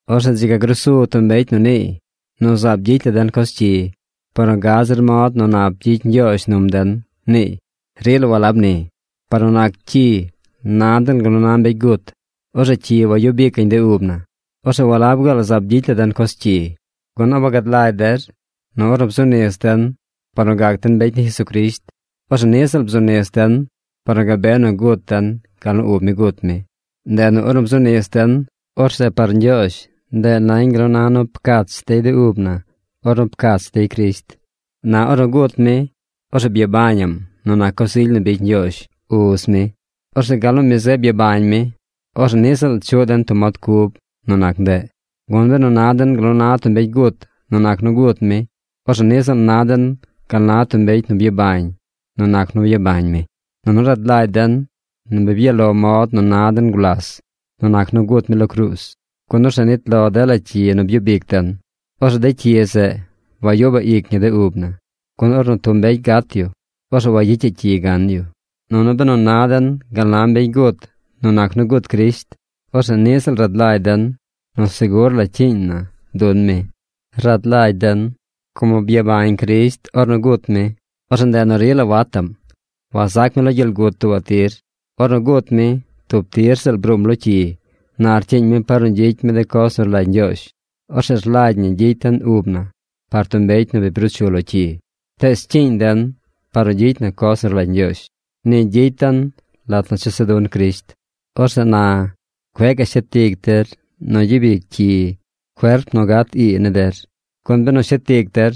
Orzeꞌ dzi ga gruu su tub mbecy nu niiy nu zaab gyicy la den coz cyi par nu gad zir mod nu nap gyicy Ñgyoozh num den, niiy. ¡Rila walab ni! Par nu nac cyi, na den gal nu na mbecy gut. Orzeꞌ cyi wayub icaꞌñ de ub na. Orzeꞌ ¿walab gaal zaab gyicy la den coz cyi? ¿Gun a wagad lagy der nu ornu bzu nis den par nu gac den mbecy ni Jesucrisht, orzeꞌ niꞌ ziꞌl bzu nis den par nu gabe nu gut den gal nu ub mi gut mi? Ndeꞌ nu ornu bzu nis den, orzeꞌ par Ñgyoozh ndeꞌ nañ gal nu na nu pcach dey de ub na ornu pcach dey Crisht. Na ornu gut mi, orzeꞌ byabañaꞌm nu nac coz ily nu bicy Ñgyoozh, Uz mi. Orzeꞌ gal nu mi zeꞌ byabañ mi, orzeꞌ niꞌ ziꞌl chuꞌ den tub mod cub nu nac ndeꞌ. Gun benu na den gal na tub mbecy gut nu nac nu gut mi, orzeꞌ niꞌ ziꞌl na den gal na tub mbecy nu byabañ nu nac nu byabañ mi. Nunu rad lagy den nu bi byaꞌ lo mod nu na den gulas nu nac nu gut mi lo cruuz, gun orzeꞌ nit lo dela cyi nu byub ic den. Orzeꞌ de cyi zeꞌ wagyubaꞌ ic ñi de ub na. Gun ornu tub mbecy gat yu, orzeꞌ wayicyaꞌ cyi gan yu. Nunu benu na den gal na mbecy gut nu nac nu gut Crisht, orzeꞌ niꞌ ziꞌl rad lagy den nu segur la cyiiñ na dun mi. Rad lagy den como byabañ Crisht ornu gut mi, orzeꞌ ndeꞌ nu rila wataꞌm. Wazac mi lo gyel gut tuubaꞌ tir. Ornu gut mi, tub tir ziꞌl bruum lo cyi. Na rcyiiñ mi par nu gyicy mi de coz nu rlagy Ñgyoozh. Orzeꞌ rlagy ñi gyicy den ub na par tub mbecy nu bi bruu chu lo cyi, tees cyiiñ den par nu gyicy na coz nu rlagy Ñgyoozh. Ni gyicy den lat nu chesa dun Crisht. Orzeꞌ na cueꞌ gaꞌ shet ic der nu gyub ic cyi cuerp nu gat ii ni der, gun benu shet ic der,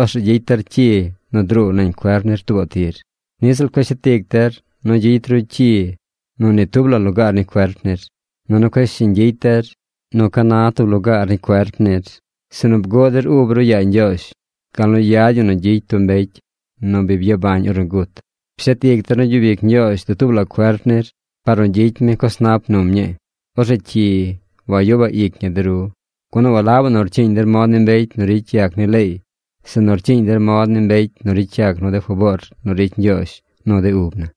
orzeꞌ gyicy der de cyi nu druu nañ cuerp nir tuubaꞌ tir. Niꞌ ziꞌl cueꞌ shet ic der nu gyicy ru cyi nu ni tub la lugaar ni cuerp nir. Nunu cueꞌ shiñ gyicy der nu ca na tub lugaar ni cuerp nir, sinu bguꞌ der ub ru yaa Ñgyoozh gal nu yad ñi nu gyicy tub mbecy nu bi byabañ ornu gut. Pshet ic der nu gyub ic Ñgyoozh dutuub la cuerp nir par nu gyicy mi coz nap num ñii. Orzeꞌ cyi wayubaꞌ ic ñi de ru, gun walabaꞌ nu rcyiiñ der mod ni mbecy nu ricy yac ni leey, sinu rcyiiñ der mod ni mbecy nu ricy yac nu de faboor nu ricy Ñgyoozh nu de ub na.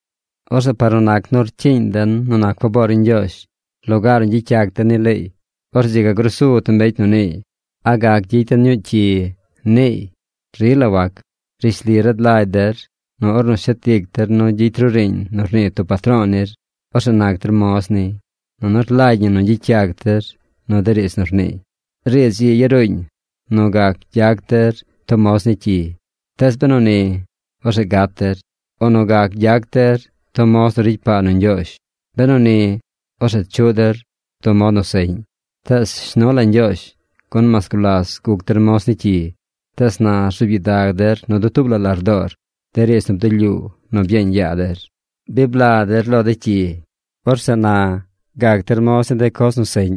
Orzeꞌ par nu nac nu rcyiiñ den nu nac faboor ni Ñgyoozh lugaar nu gyicy yac den ni leey, orzeꞌ dzi ga grusu tub mbecy nu niiy: “¿A gac gyicy den ñuu cyi?” niiy. ¡Rila wac! Rishli rad lagy der nu ornu shet ic der nu gyicy ru riiñ nu rnii tub patro̱o̱ nir, orzeꞌ nac der moz niy, nunu rlagy ñi nu gyicy yac der nu de riidz nu rniiy. Riidz ii yaruuñ nu gac gyac der tub moz ni cyi. Tees benu ni, orzeꞌ gat der. O nu gac gyac der tub moz nu ricy paa nu Ñgyoozh. Benu ni, orzeꞌ chuꞌ der tub mod nu seꞌñ. Tees shnu la Ñgyoozh, gun mas gulas guc der moz ni cyi, tees na rzuub gyidag der nu dutuub la lardoor de riidz nu bdulyuu nu byeeñ yaa der. Bi bla der lo de cyi. Orzeꞌ na gac der moz ni de coz nu seꞌñ.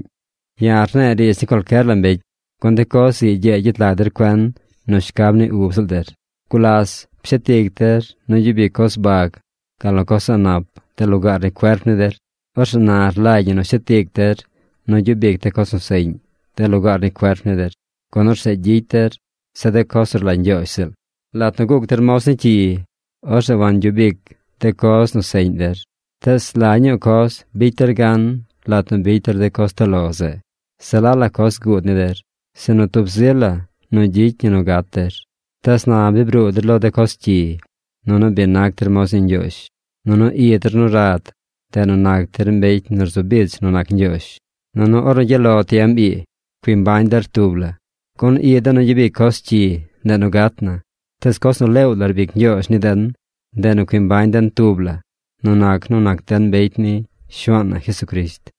(Ya̱ rne̱e̱ riidz ni cualcyer la mbecy, gun de coz ii gyee gyet lag der cuen nu shcab ni ub ziꞌl der.) Gulas pshet ic der nu gyub ic coz bag, gal nu coz a̱ꞌ nap de lugaar ni cuerp ni der. Orzeꞌ na rlagy ñi nu shet ic der nu gyub ic de coz nu seꞌñ de lugaar ni cuerp ni der, gun orzeꞌ gyicy der se de coz nu rlagy Ñgyoozh ziꞌl. Lat nu guc der moz ni cyi, orzeꞌ wangyub ic de coz nu seꞌñ der. Tees ¿la ñuu coz bicy der gan lat nu bicy der de coz toꞌ lo zeꞌ? Se la la coz guud ni der, sinu tub zi la nu gyicy ñi nu gat der. Tees na bi bruu der lo de coz cyi, nunu bi nac der moz ni Ñgyoozh. Nunu i der nu rad, ndeꞌ nu nac der mbecy nu rzu bich nu nac Ñgyoozh. Nunu ornu gyaꞌ lo tiem ii, cui mbañ der tub la. Gun i den nu gyabic coz cyi, ndeꞌ nu gat na. Tees coz nu leew la rbic Ñgyoozh ni den, ndeꞌ nu cui mbañ den tub la nu nac nu nac den mbecy ni Shuaan na Jesucrisht.